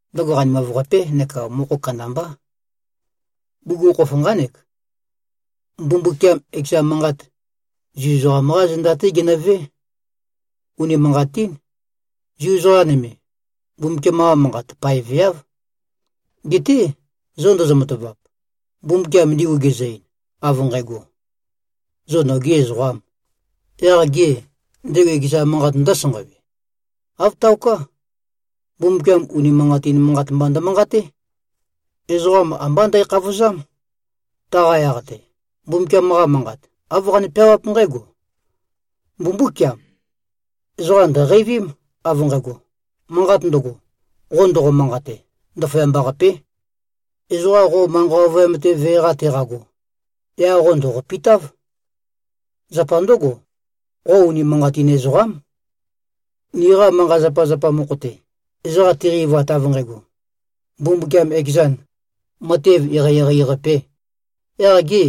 Ndøgo qanimav-qapé neka mokho kandambá. Bugukhokhof nqánek: Mbumbukiam ekeza manqat, Zu ezoqam-qá zenda-té genøvé. Unimanqatín, Zu ezoqa nøme, Mbumbukiam-qa manqat paeveáv. Geté, zô ndozo-matavap? Mbumbukiam ndigu gezø-ein, av nqægo, “Zo nogī ezoqām,” yaq gê, ndego ekeza manqat ndǿsanqawe? Āv taoká. Mbumbukiam unimanqatin manqat mba ndømanqaté. Ezoqam ambá ndækhavozám. Taqa yaq-te, Mbumbukiam-qa Manqat, āv qane-peawáp nqǽgo, “Mbumbúkiam! Ezoqa ndø̀qeivím, av nqægo: Manqat ndøgo, qo ndoqo-manqate, ndaføyamba-qapé. Ezoqa qo manqa ovøyam-te vee-qa teqago, yaq qo ndòqopitáv. Zapa ndǿgo, qo unimanqatin ezoqám.” Niqa manqa-zapazapa mokho-te, ezoqa tiqeivat av nqægo, Mbumbukiam ekezan, matev eqeieqei-qapē, yaq gê,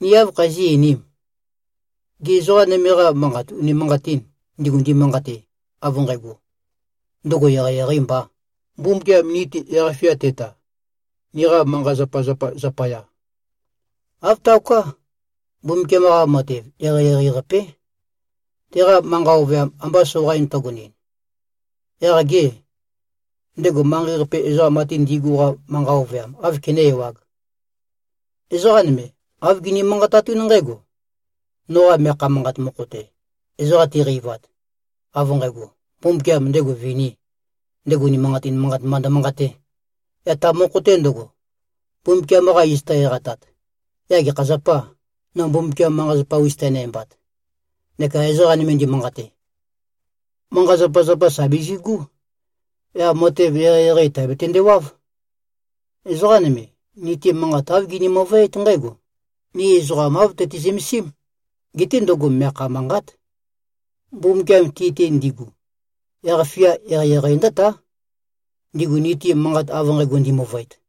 ni áv khazí꞉-einīm? Gê, ezoqa nøme-qa manqat unimanqatîn, ndigu ndimanqate, av nqægo, ndøgo eqeieqeī mbā, Mbumbukiam ni-te yaq-fia teta, niqa manqa-zapazapa zapaya? Āv taoká. Mbumbukiam-qa matev eqeieqei-qapé. Teqa manqa ovøyam amba soqain tøgonɨn, yaq gê, ndego manqei-qape ezoqa ate ndi꞉gu-qa manqa ovøyam áv kené-ewāg? Ezoqa nøme, āv gini-manqatatún nqǽgo, “Noqa meakha manqat mokho-te, ezoqa tiqeivat, av nqægo, Mbumbukiam ndego vinī, ndego unimanqatin manqat mba ndømanqatē, yaq ta mokho-te ndøgo, Mbumbukiam-qa iz tø-eqatat, yaq gekha zapâ, no Mbumbukiam manqa-zapa-us tenæmbat?” Neka ezoqa nøme ndimanqate, “Manqa-zapazapa, sà bizigú. Yaq matev eqeieqei tàbetønde-wáv.” Ezoqa nøme, ni-te manqat āv gini-møvøét nqǽgo: Ni ezoqam āv tøti-zømesím. Geté ndøgo meakha manqát. Mbumbukiam ti-te ndigu, yaq-fia eqeieqei ndǿtá, ndigu ni-te manqat av nqægo ndimøvøet.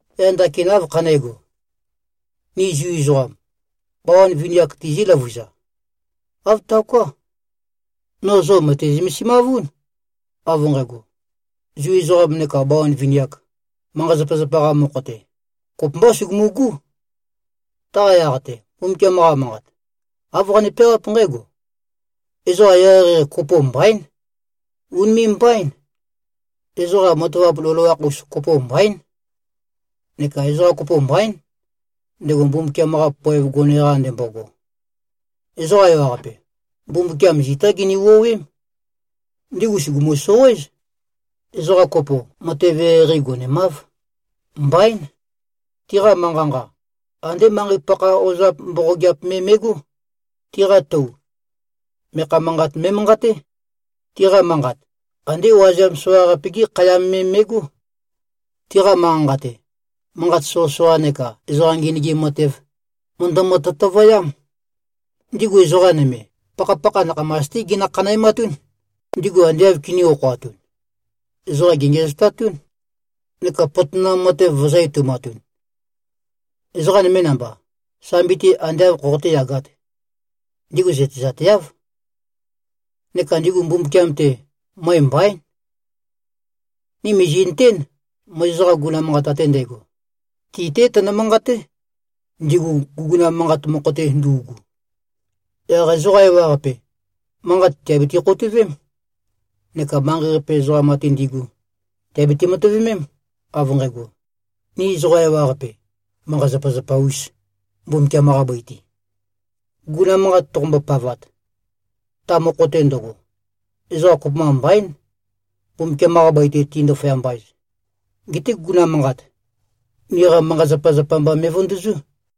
Yaq ndakin áv khané꞉go? Ni Zu ezoqam, bawan vini-ak tizí-løvuza? Āv taoká. No zo mø̀te-zømesimavún, av nqægo, Zu ezoqam neka bawan vini-ak, manqa-zapazapa-qa mokho-te, kopømbá sugumu꞉gú. Taqa yaq-te, Mbumbukiam-qa Manqat, āv qane-peawáp nqǽgo: “Ezoqa eqeieqei kopo mbaín. Ùnime꞉-mbaín. Ezoqa matavap loloakh-us kopo mbaín. Neka ezoqa kopo mbaín, ndego Mbumbukiam-qa poev gone-qa ndembogo. Ezoqa ewaqape, Mbumbukiam zitá gini-wuowém. Ndigu sùgumu-soqoéz. Ezoqa kopo, matev eqeieqei gonemáv. Mbaín. Tiqa manqa-nqa, andé manqei-pakha ozap mboqogeap me me꞉gó. Tiqa tou, meakha manqat me꞉manqaté. Tiqa manqat, andé wazeam soqaqape-gi khayam me me꞉gó. Tiqa manqa-nqa-te, manqat soqøsoqa neka ezoqa ngenøgim matev, mø̀ndømø-tøtøvøyám. Ndigu ezoqa nøme, pakhapakha nakhamas-té ginø-khanæmatún. Ndigu ande āv kinī-okhoatun, ezoqa gèngiæzotatún neka potonam matev vø̄zø-etoumatun. Ezoqa nøme namba, sambi-te ande āv khoqoté-yagāt, ndigu zøtezateáv. Neka ndigu Mbumbukiam-te, møe mbaín.” Ni mìzi꞉nøtén, Mozes-qa guguna manqat ate ndægo, ti-té tønø-manqaté, ndigu guguna manqat mokho-te ndu꞉gu. Yaq ezoqa ewaqape, manqat tìabiti-khoutøvém, neka manqei-qape ezoqam ate ndi꞉gu tìabiti-matøvemém, av nqægo, ni ezoqa ewaqape, manqa-zapazapa-ūs, Mbumbukiam-qa bøi-te. Guguna manqat toqombo-pavat, ta mokho-te ndøgo, ezoqa kopømba mbaín, Mbumbukiam-qa bøi-te ti꞉-ndaføyamba-ez. Geté guguna manqat, niqa manqa-zapazapa mba me꞉vøndøzú.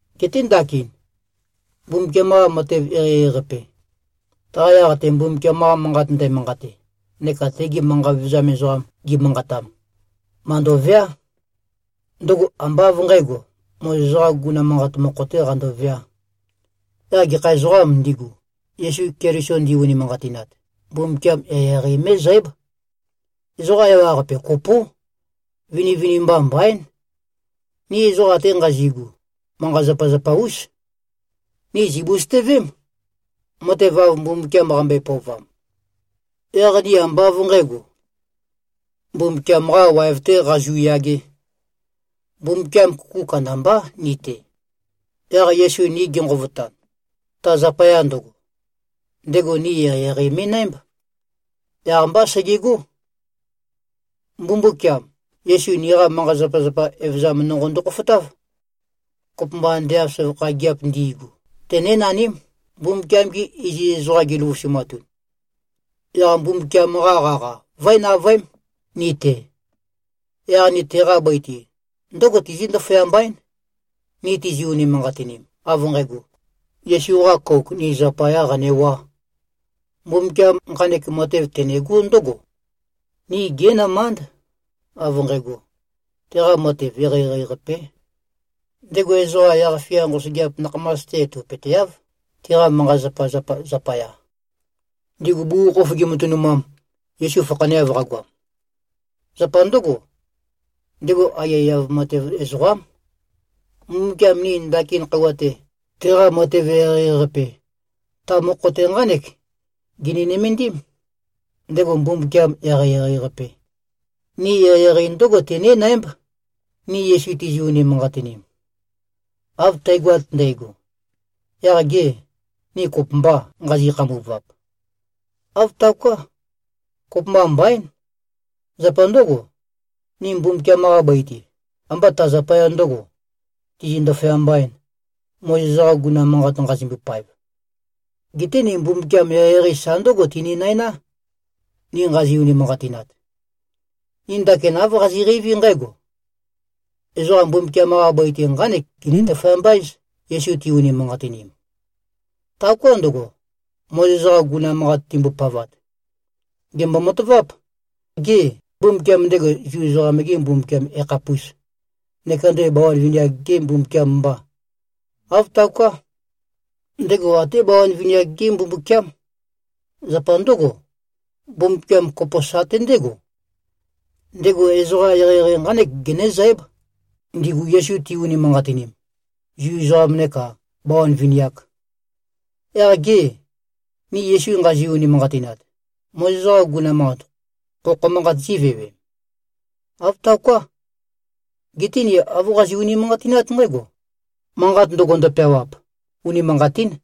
Geté ndakin, Mbumbukiam-qa matev eqeieqei-qape, taqa yaq-te Mbumbukiam-qa Manqat ndæmanqate neka tegi manqa vevezam ezoqam gi꞉manqatam, màndoveá. Ndøgo ambá av nqǣgo, Mozes-qā guguna manqat mokho-tē qandoveā. Yaq gekha ezoqām ndigu, Yesu Keliso ndi-unimanqatinat, Mbumbukiam eqeieqei mé꞉zǽb. Ezoqa ewaqape kopó. Vinivinimba mbaín. Ni ezoqa ate nqazi꞉gu, manqa-zapazapa-ús. Ni zìbusøtøvém, matev, av Mbumbukiam qambøe-pøovam. Yaq ni ambá av nqǣgo, Mbumbukiam-qā waev-tē qazu꞉yagē. Mbumbukiam kuku kandambá ni-te. Yaq Yesu ni genqovotan, ta zapaya ndøgo, ndego ni eqeieqei me꞉nǽmb. Yaq-mbá segegó. Mbumbukiam, Yesu niqa manqa-zapazapa evøzam nonqo ndokhofotáv. Kopømba ande av søvakha gigiap ndi꞉gu, tenénaním, Mbumbukiam-gi iziz ezoqam giløvusumatun, yaq Mbumbukiam-qa qaqa vǿe-navøém, ni-te. Yaq ni teqa bøi-te ndǿgo tizí꞉-ndaføyamba-én, ni tizi-unimanqatinim, av nqægo, Yesu-qa kouk ni zapayā qanewā. Mbumbukiam nqanek matev tenegó ndǿgo: Ni gí꞉nømánd, av nqægo, teqa matev eqeieqei-qapé. Ndego ezoqa yaq-fia nqosøgeap nakhamas-te etopøteáv, tiqa manqa-zapazapa zapaya, ndigu bugukhokhof gimatønumam, Yesu fakhaneav qagoam. Zapa ndǿgo, ndego aiyaiyav matev ezoqám. Mbumbukiam ni ndakin khøuwa-te, teqa matev eqeieqei-qape, ta mokho-te nqánek gini-nømendím: Ndego Mbumbukiam eqeieqei-qape, ni eqeieqei ndǿgo tenénǽmb, ni Yesu tizi-unimanqatinim. Av tægoat ndægo, yaq gê, ni kopømbâ nqazi꞉-khambuvap? Āv taoká. Kopømba mbaín! Zapa ndǿgo. Ni Mbumbukiam-qa bøi-te, ambá ta zapaya ndø̄go, tizi꞉-ndaføyamba-ēn, Mozes-qa guguna manqat nqazimbo-paev. Geté ni Mbumbukiam eqeieqei sa ndǿgo tininæná, ni nqazi-unimanqatinat. Ni ndakin āv qazi꞉qeiví nqǽgo: Ezoqa Mbumbukiam-qa bøi-te nqánek giní-ndaføyamba-éz, Yesu ti-unimanqatinim. Taoká ndøgo, Mozes-qa guguna manqat timbopavat. Gèmbo-mataváp. Gê, Mbumbukiam ndego Zu ezoqam-gê Mbumbukiam yakhapùs? Neka ndego bawan vini-ak-gê Mbumbukiâm mbà? Āv taoká. Ndego até bawan vini-ak-gé Mbumbukiám. Zapa ndǿgo, Mbumbukiam kopo sate ndégo. Ndego ezoqa eqeieqei nqánek genézǽb, ndigu Yesu ti-unimanqatinim, Zu ezoqam nekā bawan vini-ak. Yaq gê, ni Yesu nqazi-unimanqatinat, Mozes-qa guguna manqat khokho manqat zívewe? Āv taoká. Geté ni āv qazi꞉-unimanqatinát nqǽgo: Manqat ndøgo ndøpeawap, unimanqatín.